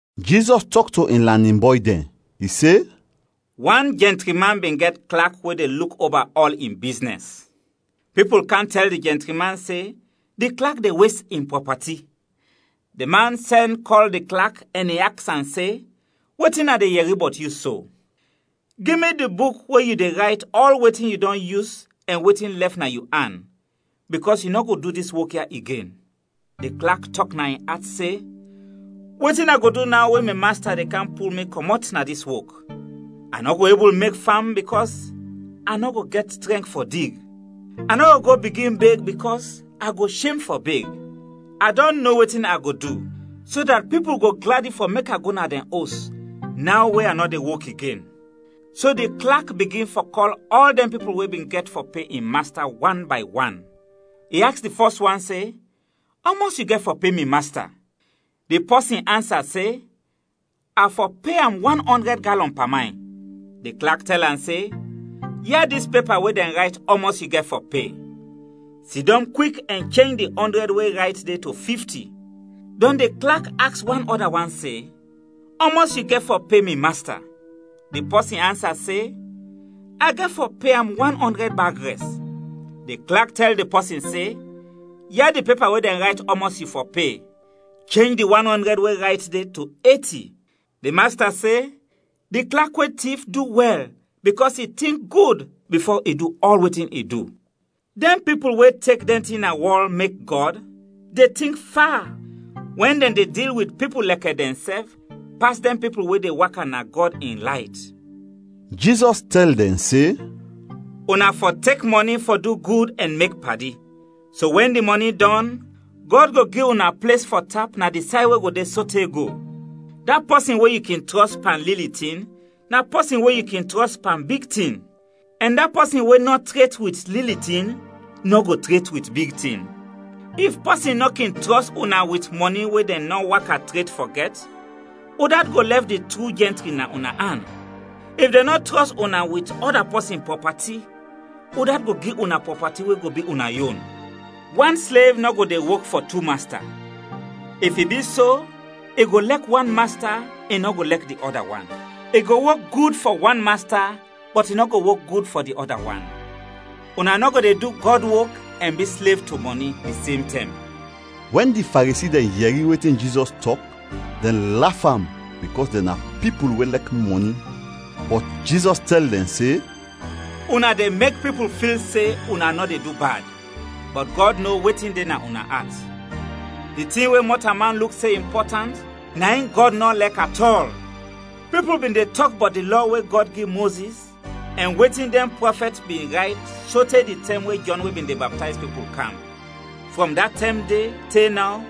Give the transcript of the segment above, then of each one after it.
Jizɔs tɔk to in lanin bɔy dɛn. I se, “Wan jɛntri man bin gɛt klak we de luk oba ɔl in biznɛs. Pipul kam tɛl di jɛntri man se di klak de wes in prɔpati. Di man sɛn kɔl di klak ɛn i aks am se, ‘Wetin a de yɛri bɔt yu so? Gi mi di buk we yu de rayt ɔl wetin yu dɔn yus ɛn wetin lɛf na yu an, bikɔs yu nɔ go du dis wok ya igen.’ Di klak tɔk na in at se, ‘Wetin a go du naw we mi masta de kam pul mi kɔmɔt na dis wok? A nɔ go ebul mek fam bikɔs a nɔ go gɛt trɛnk fɔ dig. A nɔ go go bigin beg bikɔs a go shem fɔ beg. A dɔn no wetin a go du so dat pipul go gladi fɔ mek a go na dɛn os naw we a nɔ de wok igen.’ “So di klak bigin fɔ kɔl ɔl dɛn pipul we bin gɛt fɔ pe in masta wan bay wan. I aks di fɔs wan se, ‘Ɔmɔs yu gɛt fɔ pe mi masta?’ Di pɔsin ansa se, ‘A fɔ pe am wan ɔndrɛd galɔn pamayn.’ Di klak tɛl am se, ‘Ya dis pepa we dɛn rayt ɔmɔs yu gɛt fɔ pe; sidɔm kwik ɛn chenj di ɔndrɛd we rayt de to fifti.’ Dɔn di klak aks wan ɔda wan se, ‘Ɔmɔs yu gɛt fɔ pe mi masta?’ Di pɔsin ansa se, ‘A gɛt fɔ pe am wan ɔndrɛd bag rɛs.’ Di klak tɛl di pɔsin se, ‘Ya di pepa we dɛn rayt ɔmɔs yu fɔ pe; chenj di wan ɔndrɛd we rayt de to eti.’ “Di masta se di klak we tif du wɛl bikɔs i tink gud bifo i du ɔl wetin i du. Dɛn pipul we tek dɛn tin na wɔl mek gɔd, de tink fa wɛn dɛn de dil wit pipul lɛkɛ dɛnsɛf pas dɛn pipul we de waka na Gɔd in layt.” Jizɔs tɛl dɛn se, “Una fɔ tek mɔni fɔ du gud ɛn mek padi, so wɛn di mɔni dɔn, Gɔd go gi una ples fɔ tap na di say we go de sote go. Da pɔsin we yu kin trɔs pan lili tin na pɔsin we yu kin trɔs pan big tin, ɛn da pɔsin we nɔ tret wit lili tin nɔ go tret wit big tin. If pɔsin nɔ kin trɔs una wit mɔni we dɛn nɔ waka tret fɔ gɛt, udat go lɛf di tru jɛntri na una an? If dɛn nɔ trɔs una wit ɔda pɔsin prɔpati, udat go gi una prɔpati we go bi una yon? “Wan slev nɔ go de wok fɔ tu masta. If i bi so, i go lɛk wan masta, i nɔ go lɛk di ɔda wan. I go wok gud fɔ wan masta, bɔt i nɔ go wok gud fɔ di ɔda wan. Una nɔ go de du Gɔd wok ɛn bi slev to mɔni, di sem tɛm.” Wɛn di Faresi dɛn yɛri wetin Jizɔs tɔk, dɛn laf am bikɔs dɛn na pipul we lɛk mɔni. Bɔt Jizɔs tɛl dɛn se, “Una de mek pipul fil se una nɔ de du bad, bɔt Gɔd no wetin de na una at. Di tin we mɔtalman luk se impɔtant, na in Gɔd nɔ lɛk at ɔl. “Pipul bin de tɔk bɔt di Lɔ we Gɔd gi Mozis ɛn wetin dɛn prɔfɛt bin rayt sote di tɛm we Jɔn we bin de baptayz pipul, kam. Frɔm da tɛm de te naw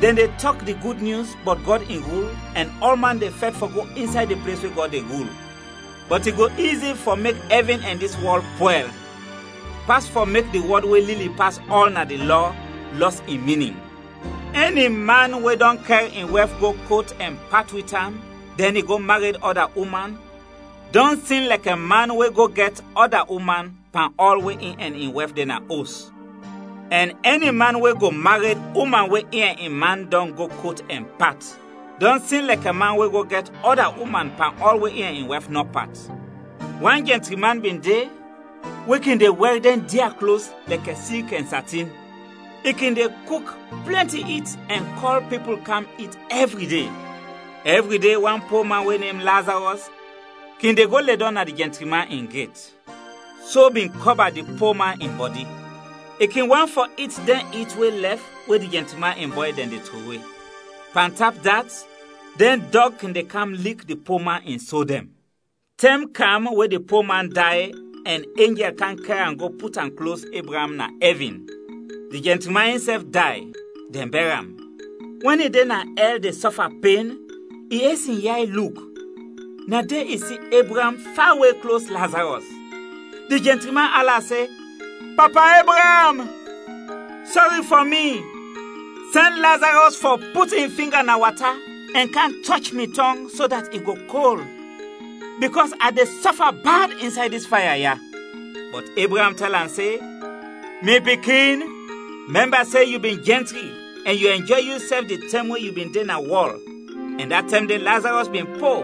dɛn de tɔk di Gud Nyus bɔt Gɔd in rul ɛn ɔlman de fɛt fɔ go insay di ples we Gɔd de rul. Bɔt i go izi fɔ mek ɛvin ɛn dis wɔl pwɛl, pas fɔ mek di wɔd we lili pas ɔl na di Lɔ, lɔs in minin. “Ɛni man we dɔn kɛr in wɛf go kot ɛn pat wit am dɛn i go mared ɔda uman, dɔn sin lɛkɛ man we go gɛt ɔda uman pan ɔl we in ɛn in wɛf de na os; ɛn ɛni man we go mared uman we in ɛn in man dɔn go kot ɛn pat, dɔn sin lɛkɛ man we go gɛt ɔda uman pan ɔl we in ɛn in wɛf nɔ pat. “Wan jɛntri man bin de we kin de wɛr dɛn dia klos lɛkɛ silk ɛn satin. I kin de kuk plɛnti it ɛn kɔl pipul kam it ɛvri de. Ɛvri de, wan po man we nem Lazarɔs kin de go ledɔm na di jɛntri man in get. So bin kɔba di po man in bɔdi. I kin want fɔ it dɛn it we lɛf we di jɛntri man in bɔy dɛn de trowe. Pantap dat, dɛn dɔg kin de kam lik di po man in so dɛn. “Tɛm kam we di po man day ɛn enjɛl kam kɛr am go put am klos Ebraam na ɛvin. Di jɛntri man insɛf day, dɛn bɛr am. Wɛn i de na ɛl de sɔfa pen, i es in yay luk, na de i si Ebraam fawe klos Lazarɔs. Di jɛntri man ala se, ‘Papa Ebraam, sɔri fɔ mi! Sɛn Lazarɔs fɔ put in finga na wata ɛn kam tɔch mi tɔng so dat i go kol, bikɔs a de sɔfa bad insay dis faya ya!’ “Bɔt Ebraam tɛl am se, ‘Mi pikin, mɛmba se yu bin jɛntri ɛn yu ɛnjɔy yusɛf di tɛm we yu bin de na wɔl ɛn da tɛm de Lazarɔs bin po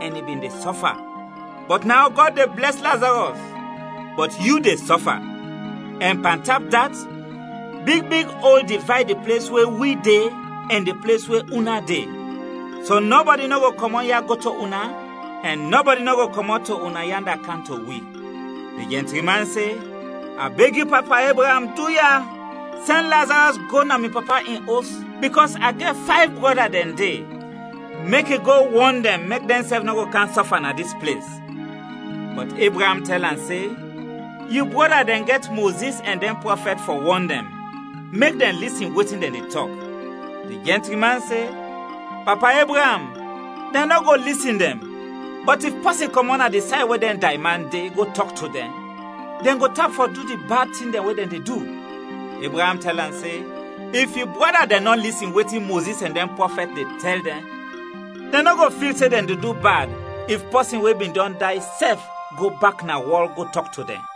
ɛn i bin de sɔfa. Bɔt naw Gɔd de blɛs Lazarɔs bɔt yu de sɔfa. Ɛn pantap dat, big big ol divayd di ples we wi de ɛn di ples we una de, so nɔbɔdi nɔ go kɔmɔt ya go to una, ɛn nɔbɔdi nɔ go kɔmɔt to una yanda kam to wi.’ Di jɛntri man se, ‘A beg yu, Papa Ebraam, duya, sɛn Lazarɔs go na mi papa in os bikɔs a gɛt fayv brɔda dɛn de, mek i go wɔn dɛn mek dɛnsɛf nɔ go kam sɔfa na dis ples.’ “Bɔt Ebraam tɛl am se, ‘Yu brɔda dɛn gɛt Mozis ɛn dɛn prɔfɛt fɔ wɔn dɛn, mek dɛn lisin wetin dɛn de tɔk.’ Di jɛntri man se, ‘Papa Ebraam, dɛn nɔ go lisin dɛn; bɔt if pɔsin kɔmɔt na di say we dɛn dayman de, go tɔk to dɛn, dɛn go tap fɔ du di bad tin dɛn we dɛn de du.’ Ebraam tɛl am se, ‘If yu brɔda dɛn nɔ lisin wetin Mozis ɛn dɛn prɔfɛt de tɛl dɛn, dɛn nɔ go fil se dɛn de du bad, if pɔsin we bin dɔn day sɛf go bak na wɔl go tɔk to dɛn.’”